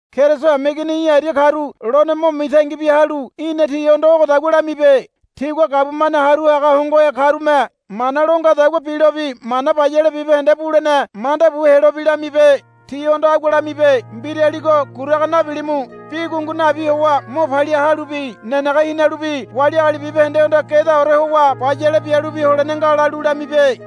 Keriso hameigini í̠ aria karu lone mo mitangi bia halu í̠na tihondo ogodagua lamibe. Tigua gabumane haru haga hongohe karume mana lo ngadagua bilobi mana bayale bibahende bulene manda bu helobi lamibe. Tihondo agua lamibe, Mbiraligo guraga nabilimu. Bi gungu nabi howa mo palia halubi nenege hinalubi wali agali bibahendehondo gedaore howa bayale bialubi holene nga, lalu lamibe.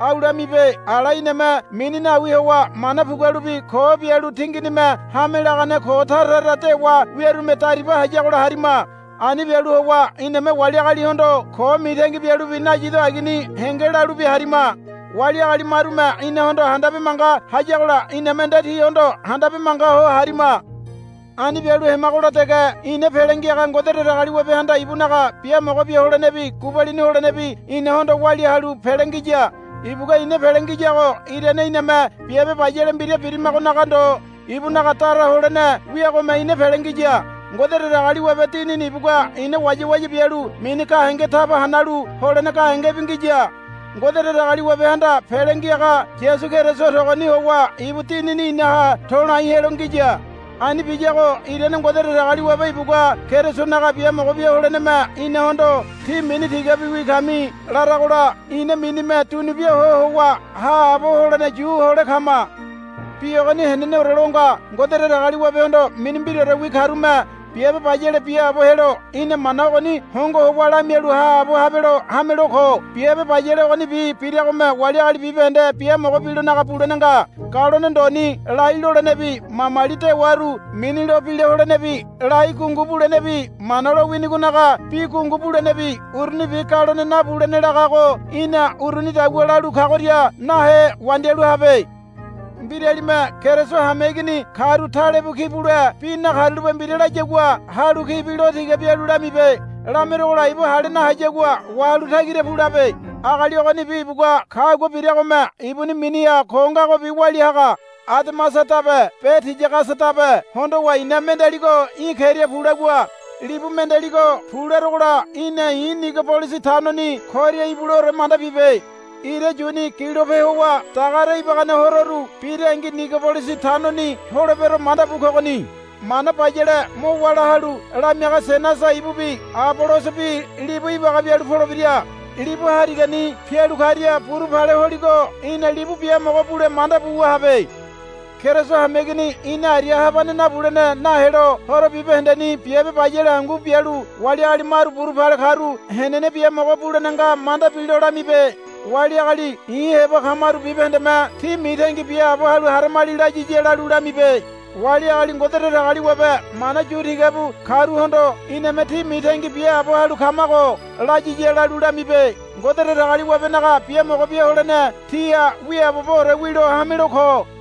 Au lamibe, Ala iname mini nawi howa mana pugualubi ko bialu tinginime hame lagane ko tara tara dewa wiarume dariba hayagola harima. Ani bialu howa iname wali agalihondo ko mitangi bialubi nayido agini henge lalubi harima. Wali agali marume inahondo handabe manga hayagola iname nde tihondo handabe manga ho harima. Ani bialu hemagola dege ina Pele Ngiaga Ngode Datagaliwabehanda ibunaga biamogo bia holenebi gubalini holenebi inahondo walia halu pele ngiya. Ibugua ina pele ngiyago irane iname biabe bayale mbira birimagonaga ndo ibunaga dara holene wiagome ina pele ngiya. Ngode Datagaliwabe Dinini ibugua ina wayawaya bialu mini gahenge taba hanalu holene gahengebi ngiya. Ngode Datagaliwabehanda Pele Ngiaga Yasu Keriso togoni howa ibu Dinini inaha to̱lai helo ngiya. Ani biyago irane Ngode Datagaliwabe ibugua Kerisonaga biamogo bia holeneme inahondo, Tí mini tigabiwi kami, laragola ina minime dunubia ho howa haabo holene yu hole kama. Bi ogoni heneneore lo nga. Ngode Datagaliwabehondo mini mbiraorewi karume biabe bayale biaabo helo í̠na mana ogoni hongo howa lamialu haabo habelo hamelo ko. Biabe bayale ogonibi biragome wali agali bibahende biamogo bilonaga bulene nga. Galone ndoni lai lolenebi mamali dewaru mini lo bila holenebi lai gungu bulenebi Mana lowinigonaga bi gungu bulenebi urunibi galone nabulene lagago í̠na urunidagua lalu kagoria nahe wandialu habe. Mbiralime Keriso hameigini karu talebu ki bule bi nakarulape mbira layagua halu kibi lo tiga bialu lamibe. Lameregola ibu hale nahayagua wahalu tagira pu labe. Agali ogonibi ibugua kagua biragome ibuni miniha ko ngagobi walia haga. Ademasadabe be Tiyagasadabe hondowa i̱na mendealigo í̠ keria pu lagua. Libu mendealigo, Pu, laragola í̠na i̱ Nigobolisi tanoni koria ibuleore manda bibe. Ira yuni gilope howa dagare ibagane hororu birangi Nigobolisi tanoni holebero manda bu kogoni. Mana bayale mo wála halu lamiaga Senasa ibubi Abolosobi libu ibaga bialu polebira. Libu harigani pialu karia buru pale holigo í̠na libu biamogo bule manda buwa habe. Keriso hameigini ina aria habane nabulene nahelo horo bibahendeni biabe bayale hangu bialu wali agali maru buru pale karu henene biamogo bulene nga manda bilo lamibe. Wali agali i̱ heba kamaru bibahendeme, Tí mitangi biaabo halu haramali, layiya lalu lamibe. Wali agali Ngode Datagaliwabe mana yu tiga bu karuhondo iname, Tí mitangi biaabo halu kamago, layiya lalu lamibe. Ngode Datagaliwabenaga biamogo bia holene tíha wiaaboboore wilo hamelo ko.